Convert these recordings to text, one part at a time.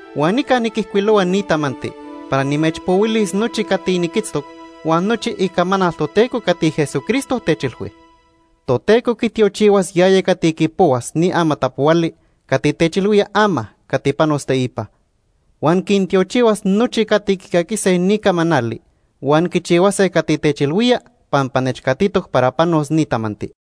Huan nica niquijcuilohua ni tamanti para nimechpohuilis nochi cati niquitztoc huan nochi icamanal Toteco cati Jesucristo techilhui. Toteco quitiochihuas yaya cati quipohuas ni amatapohuali cati techilhuía ama cati panos teipa. Huan quintiochihuas nochi cati quicaquise ni camanali huan quichihuase cati techilhuía pampa nechcatitoc para panos ni tamanti.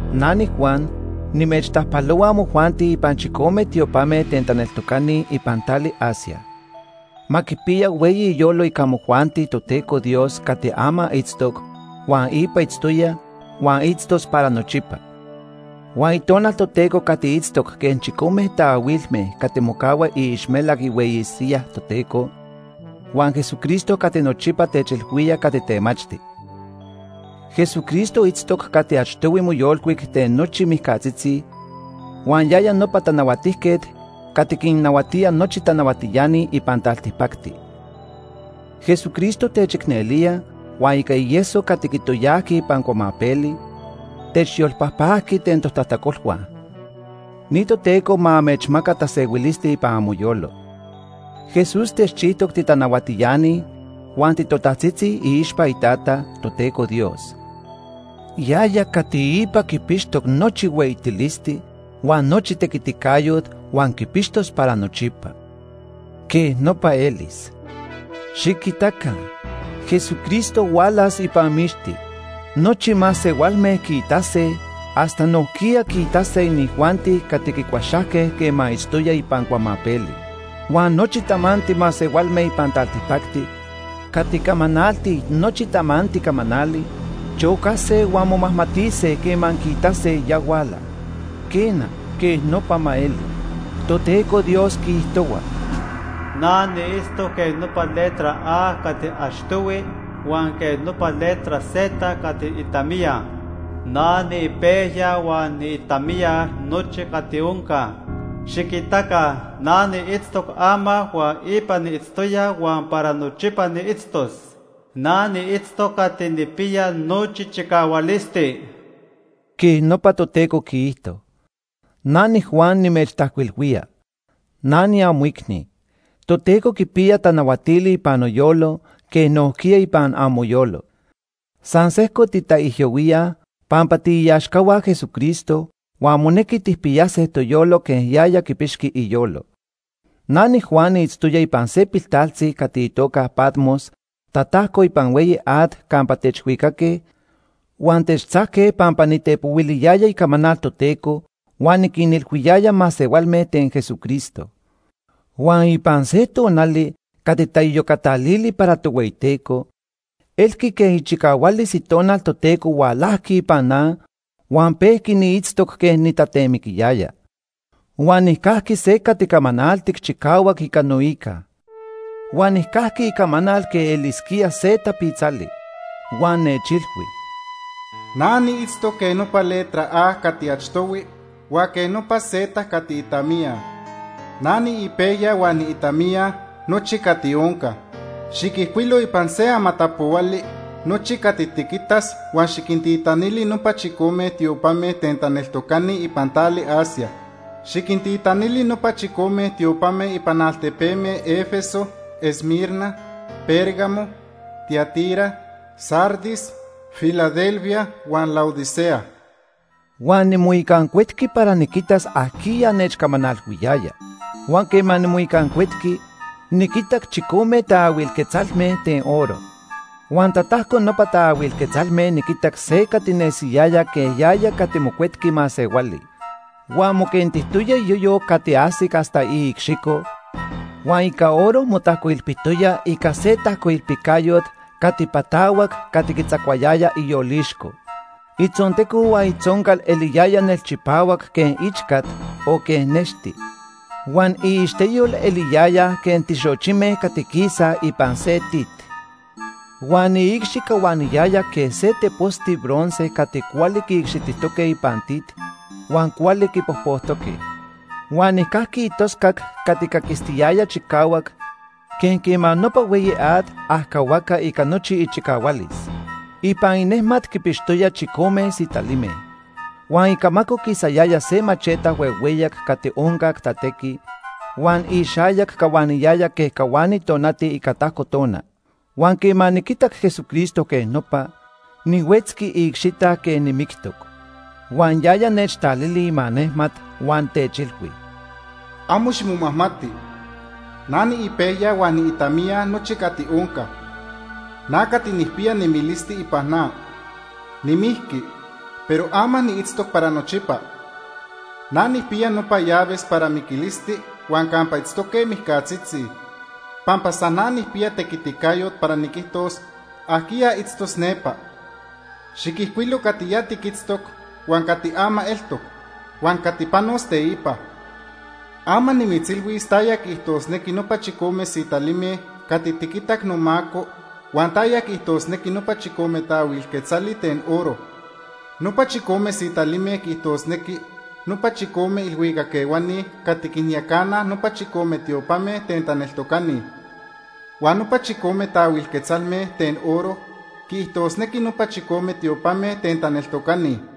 Na niJuan, nimechtajpalohua amojuanti ipan chicome tiopame ten taneltocani ipan tali Asia. Ma quipiya hueyi iyolo ica amojuanti Toteco Dios cati ama itztoc, huan ipa itztoya, huan itztos para nochipa; huan Itonal Toteco cati itztoc quej chicome taahuilme cati mocahua iixmelac ihueyi siyaj Toteco, huan Jesucristo cati nochipa techilhuía cati temachti. Jesucristo itztoc cati achtohui moyolcuic ten nochi mijcatzitzi, huan yaya nopa tanahuatijquet cati quinnahuatía nochi tanahuatiani ipan taltipacti. Jesucristo techicnelía huan ica ieso cati quitoyajqui ipan cuamapeli, techyolpajpajqui ten totajtacolhua. Ni Toteco ma amechmaca tasehuilisti ipan amoyolo. Jesús techchijtoc titanahuatiani huan titotajtzitzi iixpa iTata, Toteco Dios. Yaya cati ipa quipixtoc nochi hueyitilisti huan nochi tequiticayot huan quipixtos para nochipa. Quej nopa elis. Xiquitaca, Jesucristo hualas ipan mixti. Nochi masehualme quiitase hasta nojquiya quiitase inijuanti cati quicuaxajque quema itztoya ipan cuamapeli. Huan nochi tamanti masehualme ipan taltipacti cati camanaltij nochi tamanti camanali, chocase huan momajmatise quema quiitase ya huala. Quena, quej nopa ma eli. Toteco Dios quiijtohua: “Na niitztoc quej nopa letra A cati achtohui huan quej nopa letra Z cati itamiya. Na niipejya huan niitamiya nochi cati onca. Xiquitaca, na niitztoc ama huan ipa niitztoya huan para nochipa niitztos. Na niitztoc Cati Nijpiya Nochi Chicahualisti.” Quej nopa Toteco quiijto. Na niJuan nimechtajcuilhuía. Na niamoicni. Toteco quipiya tanahuatili ipan noyolo quej nojquiya ipan amoyolo. San sejco titaijyohuíaj pampa tiiaxcahua Jesucristo huan monequi tijpiyase toyolo quej yaya quipixqui iyolo. Na niJuan niitztoya ipan se piltaltzi cati itoca Patmos tatajco ipan hueyi at campa techhuicaque huan techtzajque pampa nitepohuiliyaya icamanal Toteco huan niquinilhuiyaya masehualme ten Jesucristo. Huan ipan se tonali cati taiyocatalili para Tohueyiteco, elqui quej ichicahualis Itonal Toteco hualajqui ipan na huan pejqui niitztoc quej nitatemiquiyaya. Huan nijcajqui se cati camanaltic chicahuac ica noica. Huan nijcajqui icamanal quej elisquía se tapitzali. Huan nechilhui: “Na niitztoc quej nopa letra A cati achtohui huan quej nopa Z cati itamiya. Na niipejya huan niitamiya nochi cati onca. Xiquijcuilo ipan se amatapohuali nochi cati tiquitas huan xiquintitanili nopa chicome tiopame ten taneltocani ipan tali Asia. Xiquintitanili nopa chicome tiopame ipan altepeme Éfeso, Esmirna, Pérgamo, Tiatira, Sardis, Filadelfia huan Laodicea.” Huan nimoicancuetqui para niquitas ajquiya nechcamanalhuiyaya. Huan quema nimoicancuetqui, niquitac chicome taahuil quetzalme ten oro. Huan tatajco nopa taahuil quetzalme niquitac se cati nesiyaya quej yaya cati Mocuetqui Masehuali. Huan moquentijtoya iyoyo cati ajsic hasta iicxico huan ica oro motajcoilpitoya ica se tajcoilpicayot cati patahuac cati quitzacuayaya iyolixco. Itzonteco huan itzoncal eliyaya nelchipahuac quej ichcat o quej nexti. Huan iixteyol eliyaya quej tixochime cati quisaj ipan se tit. Huan iicxi cahuaniyaya quej se teposti bronce cati cuali quiicxitijtoque ipan tit huan cuali quipojpojtoque. Huan nijcajqui itoscac cati caquistiyaya chicahuac quej quema nopa hueyi at ajcahuaca ica nochi ichicahualis. Ipan inejmat quipixtoya chicome sitalime. Huan icamaco quisayaya se macheta huehueyac cati oncac tatequi, huan ixayac cahuaniyaya quej cahuani tonati ica tajco tona. Huan quema niquitac Jesucristo quej nopa, nihuetzqui iicxita quej nimictoc. Huan yaya nechtalili imanejmat huan techilhui: “Amo ximomajmati. Na niipejya huan niitamiya nochi cati onca. Na cati nijpiya nemilisti ipan na. Nimijqui, pero ama niitztoc para nochipa. Na nijpiya nopa llaves para miquilisti huan campa itztoque mijcatzitzi, pampa san na nijpiya tequiticayot para niquijtos ajquiya itztos nepa. Xiquijcuilo cati ya tiquitztoc, huan cati ama eltoc, huan cati panos teipa. Ama nimitzilhuis taya quiijtosnequi nopa chicome sitalime cati tiquitac nomaco huan taya quiijtosnequi nopa chicome taahuil quetzali ten oro. Nopa chicome sitalime quiijtosnequi nopa chicome ilhuicac ehuani cati quinyacanaj nopa chicome tiopame ten taneltocani. Huan nopa chicome taahuil quetzalme ten oro quiijtosnequi nopa chicome tiopame ten taneltocani.”